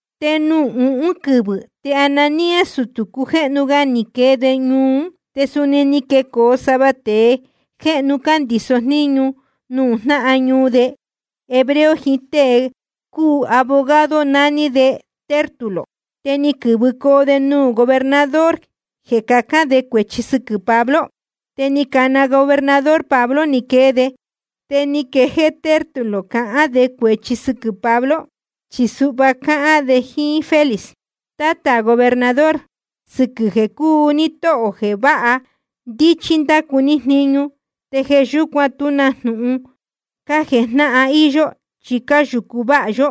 Te nuū uhún quɨvɨ̄ te Ananías, sutū cujéhnu ga, ni quee de ñuu ún. Te suni ni quecoo sava tēe jéhnu cándīso jníñu nuū jnáhan ñuu de hebreo jiín ɨɨn tēe cúu abogado, nání de Tértulo. Te ni quɨ̄vɨcoo de nuū gobernador jeē cahān de cuēchi sɨquɨ̄ Pablo. Te ni cana gobernador Pablo ni quee de. Te ni quejéé Tértulo cahán de cuēchi sɨquɨ̄ Pablo, chi suhva ni cahān de jíín Félix: Tátā gobernador, sɨquɨ̄ jeē cúu ní tóhō jeē váha ndíchí ndácu ní jniñu, te jeē yúcuan tú na jnūhun cájejnáhan íyó, chi cáyūcu váha yó.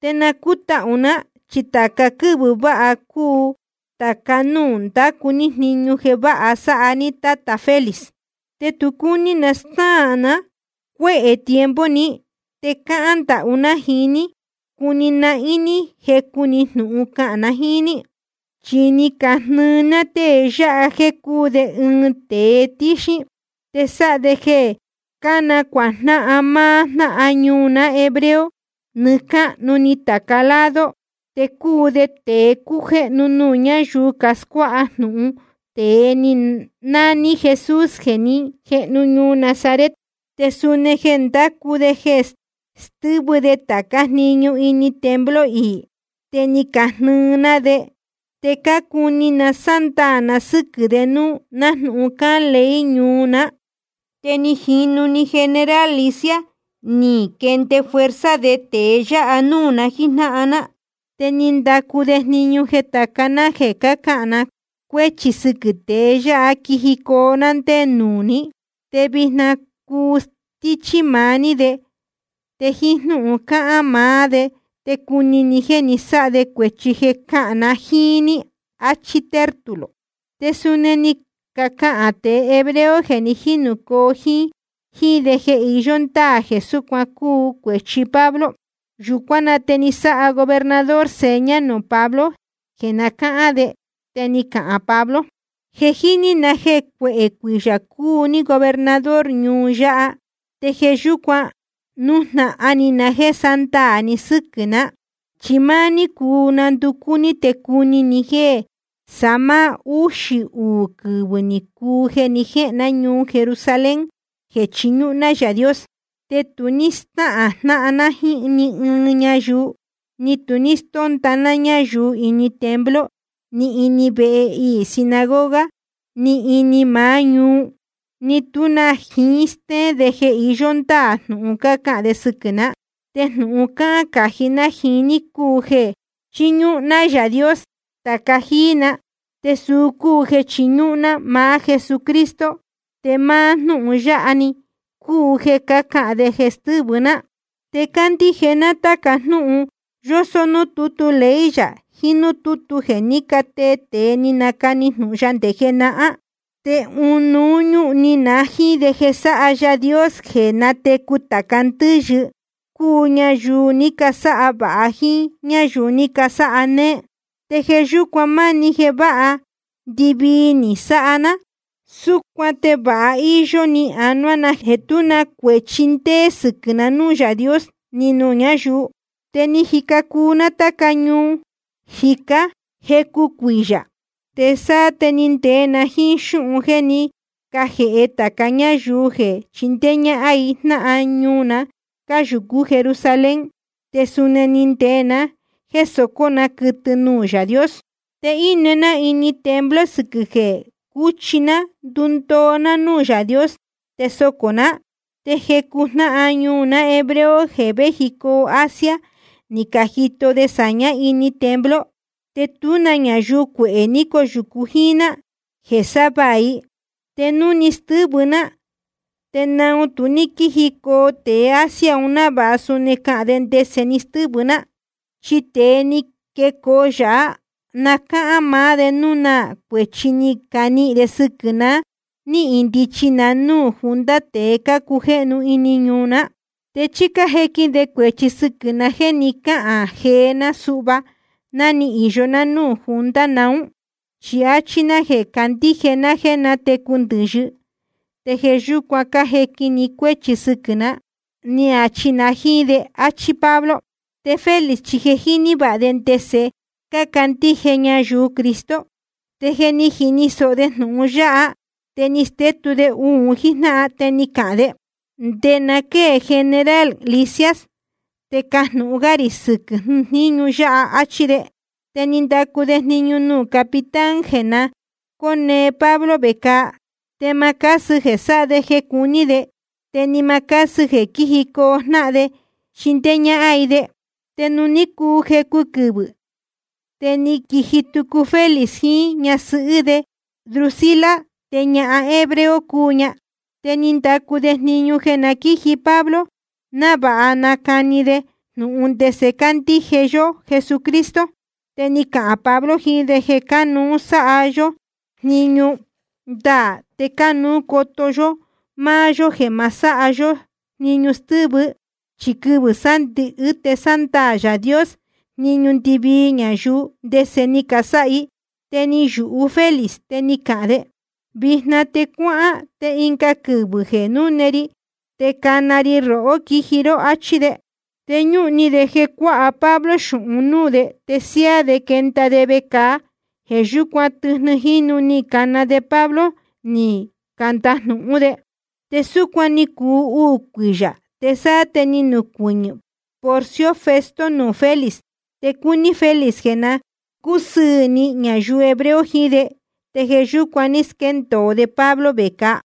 Te na cútahū ná, chi tāca quɨ́vɨ̄ vāha cúu tāca núū ndácu ní jniñu jeē váha sáha ní, tátā Félix. Te tu cúní na snáā na cuéhē tiempo ni, te cáhán ndahú ná jiín ní cuni nahín ní jecu‑ni jnūhun cahān na jíín ní. Chi ni cajini na tée yáha jéē cúu de ɨɨn tēe tíxín, te sáha de jeē cánacuajnáhan máá jnáhan ñuu ná hebreo nɨɨ́ cáhnu‑ni tāca lado, te cúu de tēe cújéhnu nuū ñáyuu cascuáha jnūhun tēe nání Jesús jeē ní jehnu ñuu Nazaret. Te suni je ndúcú de jeē stɨ́vɨ de tācá jniñu ini templo iī, te ni cajnɨɨ ná de. Te cácuni na sándaā na sɨ́quɨ̄ de núú, nájnūhun cáhán ley ñuu ná. Te ni jinū‑ni general Lisias, te ni quende fuerza de tēe yáha núū na jíjnáhan ná. Te ni ndacu de jniñu jeē tāca ná jeē cácahān na cuéchi sɨquɨ̄ tée yáha quijicoo ná ndé nuū ní. Te vijna cuu stíchí maá ní de, te jíín jnúhun cahān maá de te cuni ni jéē ni sáha de cuēchi jeē cácahān na jíín ní, áchí Tértulo. Te suni ni cacahān tēe hebreo jeē ni jínūcoo jíín de jeē iyó ndáā jeē súcuan cúu cuēchi Pablo. Yūcuán na te ni sáha gobernador seña nuū Pablo jeē na cáhán de, te ni cahān Pablo: Je jíní na jéē cuehē cuiyā cúu ní gobernador ñuu yáha, te jeē yúcuan nújnahan ni na jéē sándaā ni sɨ́quɨ̄ ná. Chi máá ní cuu nanducú ní te cuni ni jéē sáá máá úxī uū quɨvɨ̄ ni cuu jeē ni jéhēn ná ñuu Jerusalén jeē chiñúhún ná Yaā Dios. Te tu ní stáhān jnáhan ná jíín ni ɨɨn ñayuu, ni tu ní stónda ná ñáyuu ini templo ni ini vehe iī sinagoga ni ini maá ñuu. Ni tú na jiín stéén de jeē iyó ndáā jnūhun cácahān de sɨquɨ̄ ná. Te jnūhun cáhán cají ná jiín ní cúu jeē chiñúhún ná Yaā Dios tāca jíí na, te suu cúu jeē chiñúhún ná maá Jesucristo, te máá jnúhun yáha‑ni cúu jeē cácahān de jeē stɨ́vɨ ná. Te cándíje ná táca jnúhun yósó núū tútu ley yā jiín núū tútu jeē ní catee tēe ni canacani jnūhun ya nde jenahán. Te ɨnuú ñúhun ni na jíín de jeē sáha Yaā Dios jeē nátecu tāca ndɨ́yɨ, cúu ñayuu ní casáha vāha jíín ñáyuu ní casáha néé. Te jeē yúcuan máni jeē váha ndɨ́hvɨ́ ni na sáha ná. Súcuan te vāha íyó ni anuá na jéē tú na cuēchi ndéé sɨquɨ̄ na núū Yaā Dios ni nuū ñáyuu. ’Te ni jica cuu ná táca ñuu jicá jecu cuiyā, te sáá te ni ndee na jíín xúhun jéē ní cajēhe tāca ñáyuu jeē chindéé ñáhán i jnáhan ñuu na cáyūcú Jerusalén. Te suni ni ndee na jéē socó na quɨtɨ nuū Yaā Dios. Te íne ná ini templo sɨquɨ̄ jeē cuchi ná ndundoo ná núū Yaā Dios te socō ná. Te jecu jnáhan ñuu ná hebreo jeē véjicoo Asia ni cajito de sāñá ini templo, te tú na ñayuu cuehē ni cóyūcu jíín ná jeē sávaā i. Te núu ni stɨ́vɨ ná ¿te naun tu ní quíjicoo tēe Asia un návāha suni cahān de ndese ni stɨ́vɨ ná? Chí tée ni quecoo yāhá na cáhán maá de núu na cuēchi ni canihīn de sɨquɨ̄ na ná ni indichi na núū junta tēe cácujéhnu ini ñuu ná. ¿Te chí cájequin de cuēchi sɨquɨ̄ na jéē ni cáhān jee ná suhva ná ni īyo ná nuū junta naún? Chi ni achi na jéē cándíje ná jéē nátecu tāca ndɨ́yɨ, te jeē yúcuan cájequin ni cuéchi sɨquɨ̄ ná, ni achi na jíín de. Achí Pablo. Te Félix chi je jíní vāha de ndese cácandíje ñayuu Cristo. Te jeē ní jini sōho de jnūhun yáha te ni stétu de un jíjnáhan, te ni cahān de: Nde na quée general Lisias te cajnūhun gá rī sɨquɨ̄ jníñu yáha, áchí de. Te ni ndacu de jniñu nuū capitán jeē na cóne ga Pablo vecāa, te ma cásɨ jeē sáha de jeē cuní de, te ni ma cásɨ jeē quíjicoo jnáhan de jeē chindéé ñáhán i de. Te ni cuu jecu quɨvɨ̄, te ni quiji tucu Félix jiín ñasɨhɨ́ de Drusila, te ñahan hebrea cúu ña. Te ni ndacu de jniñu jeē na quíji Pablo návāha nacani de jnūhun ndese candíje yó Jesucristo. Te ni cahān Pablo jiín de jeē cánuú sáha yó jniñu ndaā, te cánuú coto yó máá yó jeē ma sáha yó jniñu stɨ́vɨ, chi quɨvɨ̄ sándɨ̄hɨ́ te sándaā Yaā Dios jniñu ndɨvii ñayuu ndese ni casáha i. Te ni yūhu Félix te ni cahān de: Vijna te cuáhán, te ɨnga quɨvɨ̄ jeē núne ri te cana ri rohó quiji ró, áchí de. Te ñúhun ni de jeē cuāha Pablo xūhun núū de te siáá de quenda de vecāa. Jeē yúcuan tɨjnɨ jínu ni cana de Pablo ni candajnūhún de. Te súcuan ni cuu uū cuiyā, te sáá te ni nucuɨñɨ̄ Porcio Festo nuū Félix. Te cúní Félix jeē na cúsɨɨ̄ ni ñayuu hebreo jiín de, te jeē yúcuan ní squéndōo de Pablo vecāa.